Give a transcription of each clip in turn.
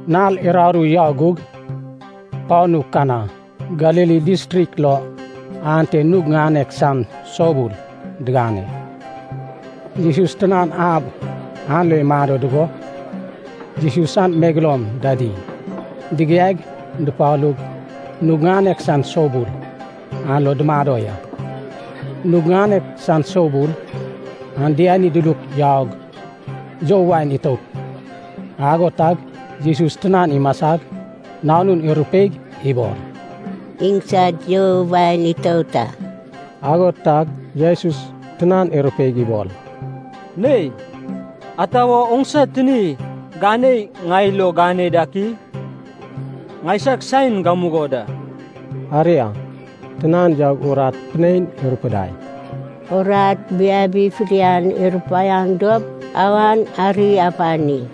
Nal uraru yau gug, panu Kana Galili distrik lo ante nug ŋanek san soubul digane. Jesus tinan ab an lo imado dugo, Jesus san megeloum dadi digiaig dupalug, nug ŋanek san soubul an lo dumado ya. Nug ŋanek san soubul an diani diluk yaug you wain itout. Ago tag Jesus tinan imasag nanun irupeig ibol, “Iŋsad you wain itout a.” Ago tag Jesus tinan irupeig ibol, “Nei, ata wo oŋsa tini ganei ŋai lo gane dak i? Ŋaisag saen gamugo da.” Aria, tinan yaug urat pinein irupudai, “Urat biabi fidian irupaiaŋ dop, awan ari apani.”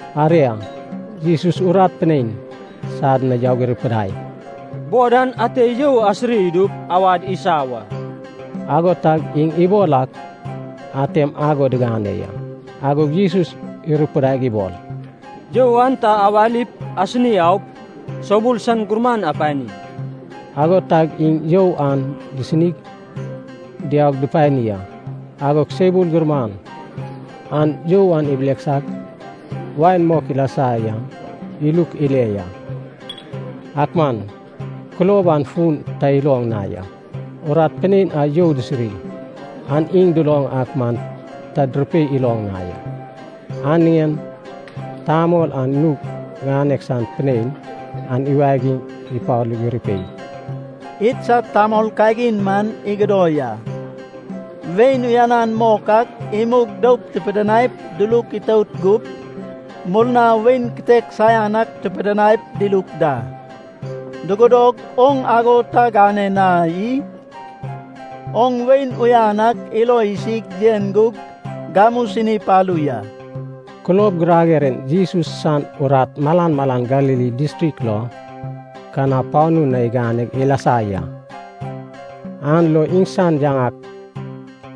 Aria, Jesus urat pinein sad na yaug irupudai, “Bod an ate you asiri idup awad isa wa.” Ago tag iŋ ibol ak atem ago digane ya. Agog Jesus irupudaig ibol, “You an ta awalip asini aup, soubul san gurman apani.” Ago tag iŋ you an disinig diaug dupani a. Agog soubul gurman an you a ibileksag wain mok ilasa yan iluk ile ya. Ak man kulob an fun ta iloŋ na ya. Urat pinein a you disiri an iŋ duloŋ ak man ta durupei iloŋ na ya. An niŋen tamol an nug ŋanek san pinein an iwagig ipalug irupei, “Idsad tamol kagin man igodo ya. Wain uyanan mok ak imug doup tupidinaip duluk itout gup, murna wain kitek saian an tupidinai diluk da. Dugodog oŋ ago ta gane na i? Oŋ wain uyan ak ilo isig yen gug gamu sini palu ya.” Kulob girager en Jesus san urat malan malan Galili distrik lo Kana panu na igane ilasa ya. An lo iŋsan yaŋak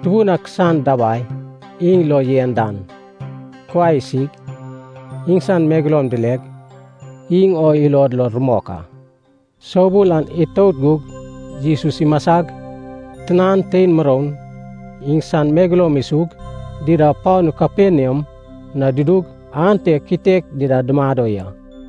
tubun ak san dabai iŋ lo yen dan kuai isig, iŋsan megeloum dileg, iŋ o ilod lo rumok a. Soubul an itout gug Jesus imasag, tinan, tein muroun, iŋsan megeloum isug, dida panu Kaperniam na dudug, ante kitek dida dumado ya.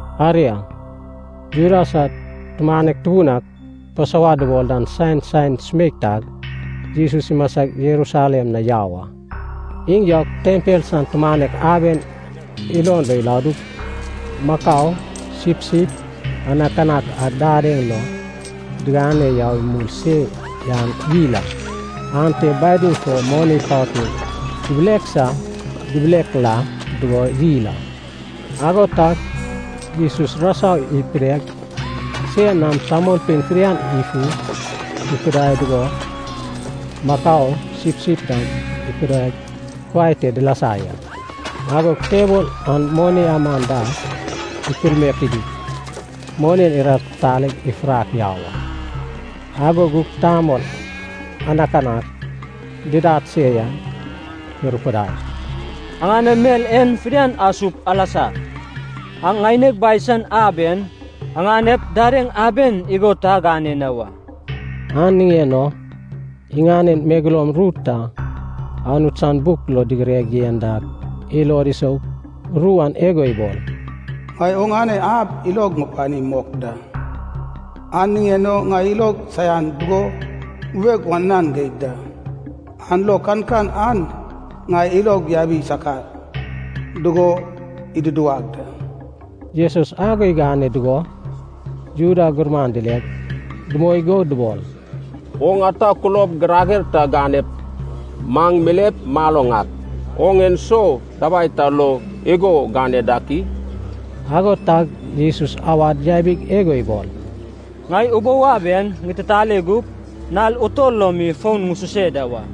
Aria, Juda sad tumanek tubun ak, Pasova dubol dan san saen sumeik tag, Jesus imasag Jerusalem na yau a. Iŋ yaug tempel san tumanek aben ilon lo iladug, makau, sipsip, anakanak a didaeŋ lo digane yau imul se yan yil a. Aenta badim fo moni patun dibileksa dibilekla dugo yil a. Ago tag Jesus rasau ipideg sen nam tamolpein fidian ifu ikudai dugo, makau, sipsip dam ikudai kuai te dilasa ya. Agog tebol an moni aman da ikulmaek idug, moni iratitaleg ifurak yau a. Ago gug tamol anakanak didad se yan irupudai, “Aŋanem mel en fidian asup alasa. Aŋ ŋaineg Bai san ab en aŋanep dadeŋ aben igo ta agane na wa.” An niŋen o iŋanen megeloum ru ta Anut san buk lo digireg yen dak ilod isou. Ru an igo ibol, “Ŋai oŋane ab ilog ŋupani mok da, an niŋen o ŋai ilog saian dugo bubeg wananan geig da, an lo kankan an ŋai ilog yabi sakar dugo iduduwag da.” Jesus ago igane dugo Juda gurman dileg, dumoi go dubol, “Oŋ ata kulob girager ta ganep maŋ milep maloŋ ak, oŋ en so dabai ta lo igo gane dak i?” Ago tag Jesus awad yabig igo ibol, “Ŋai ubou ab en ŋititale gup, nal utol lo mi fon ŋususe da wa.”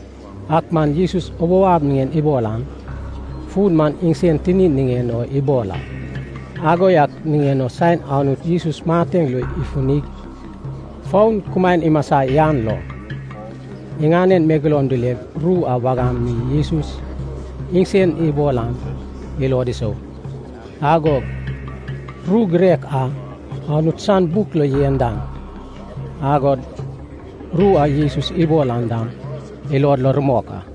Ak man Jesus ubou ab niŋen ibol an, fun man iŋsen tinin niŋen o ibol a. Ago yak niŋen o saen Anut Jesus mateŋ lo ifufunig fon kumaen imasa yan lo, iŋanen megeloum dileg ru a wagam mi Jesus iŋsen ibol an ilod isou. Agog ru girek a Anut san buk lo yen dan, agod ru a Jesus ibol an dam, ilod lo rumok a.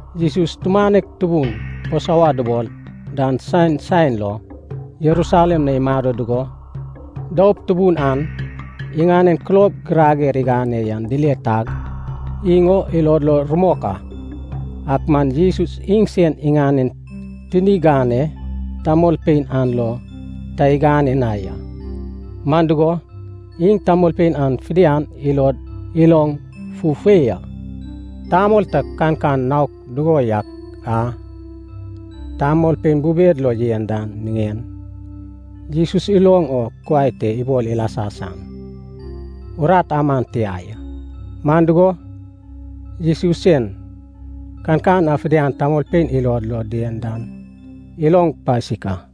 Jesus tumanek tubun Pasova dubol dan san saen lo, Jerusalem na imado dugo, doup tubun an iŋanen kulob girager igane yan dile tag, iŋ o ilod lo rumok a. Ak man Jesus iŋsen iŋanen tini ganei tamolpein an lo ta igane na ya, man dugo, iŋ tamolpein an fidian ilod iloŋ fufei a. Tamol ta kankan naok dugo yak a tamolpein bubed lo yen dan niŋen, Jesus iloŋ o kuai te ibol ilasa san urat aman tia ya. Man dugo, Jesus sen, kankan a fidian tamolpein ilod lo dien dan iloŋ pasik a.